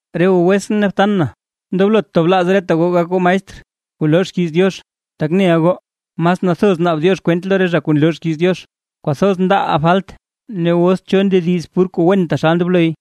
Re goo wetsʼn ne btan na, ndoblot tablaaz reta goo gak goo maestr kuu loo xkiiz Diox; tak neʼa goo mas nathoz naab Diox kwent lo re zha kuu nloo xkiiz Diox. Kwathoz ndaaʼaa falt, ne os nzo cho ndediz pur kuu wen taxal ndobloy,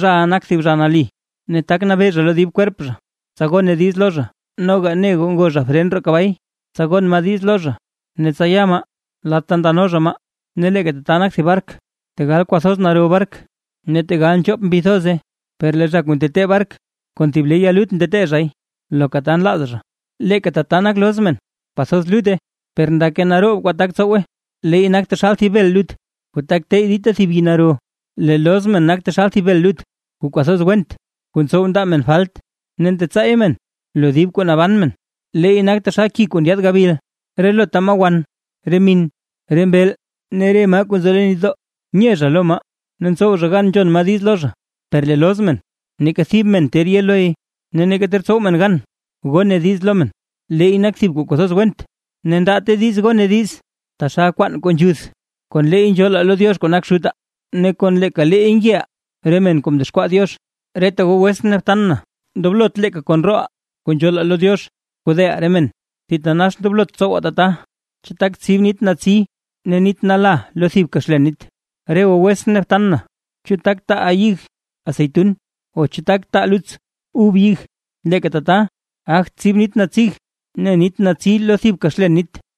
zhaʼa nak thib zha nali, ne tak nabee zha lo dib kwerp zha, tsa gone diiz lo zha. Noga ne goo ngo zha fren roo kabay, tsa gon maa diiz lo zha ne tsa ya maa lad ta ndano zha maa. Ne leeka tata nak thib bark: Tegal kwathoz naro bark ne tegal nchoop mbi thoza, per lee zha kuu ntetee bark, kon thib le ya lut ntetee zhay loka ta nlaaz zha. Leeka tata nak loz men; kwathoz lutte, per ndake naroob kwaa tak tsowe, leey nak taxal thib bel lut kuu tak teyy dita thib yii naro. Lee loz men nak taxal thib bel lut, kuu kwathoz went kuu ntsow ndaa men falt ne ntetsaay men lo dib kuu naban men. Leey nak taxal ki kuu ndyaad gabil. Relota maa wan, re min, re mbeel ne re maa kuu nzo leen nitdoo, nye zha lo maa ne ntsow zha gan nzhon maa diiz lo zha; per lee loz men, neeka thib men ter ye loy ne neeka ter tsow men gan gone diiz lo men. Leey nak thib kuu kwathoz went, ne ndaate diiz gone diiz, taxal kwaan kuu nzhuth. Kon leey nzhoolaa lo Diox kuu nak Xutaa, ne kon leeka leey ngeʼaa re men kuu mdexkwaa Diox. Reta goo wetsʼn ne btan na, ndoblot leeka kon rooʼaa kuu nzhoolaa lo Diox kodeʼaa re men, thitanax ndoblot tsowaa tata. ¿Chu tak tsib nit natsi ne nit nala lo thibka xlen nit? Re goo wetsʼn ne btan na, ¿chu tak taa ya ig aseytun o chu tak taa luts ub ig? Leeka tata, gagt tsib nit natsig ne nit natsi lo thibka xlen nit.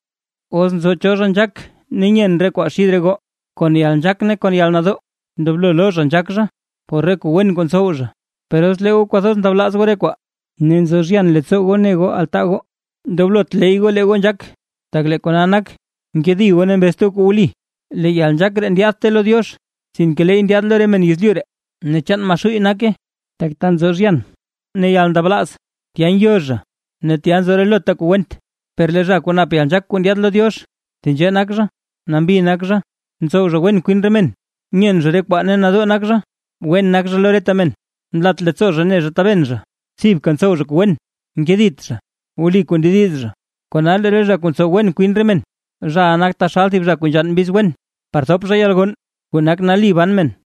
Os nzo cho zha nzhaak ne nyen re kwaa xid re goo, kon yalnzhaak ne kon yalnadoo ndoblo loo zha nzhak zha por re kuu wen kuu ntsow zha. Per os lee goo kwathoz ndablaaz goo re kwaa ne nzo zhyan leettsoo goo ne goo altaa goo, ndoblot ley goo lee goo nzhaak, tak lee kona nak nkedi goo ne mbezt goo kuu wli. Lee yalnzhaak ree ndyaadte lo Diox, sinke leey ndyaad lo re men yezlyu ree ne chaan Maxuuy nake. Tak ta nzo zhyan ne yalndablaaz, tya ngyo zha ne tya nzo relota kuu went. Per lee zha kuu nap yalnzhaak kuu ndyaad lo Diox; tenzhee nak zha: Nambi nak zha, ntsow zha wen kwin re men, nyen zha re kwaa ne nadoo nak zha, wen nak zha lo reta men, nlat leettsoo zha ne zha taben zha, thibka ntsow zha kuu wen, nkedit zha, wli kuu ndediz zha. Kona lee re zha kuu ntsow wen kwin re men, zhaʼa nak taxal thib zha nzhann mbiz wen, par thop zha yalgonn, kuu nak nali ban men.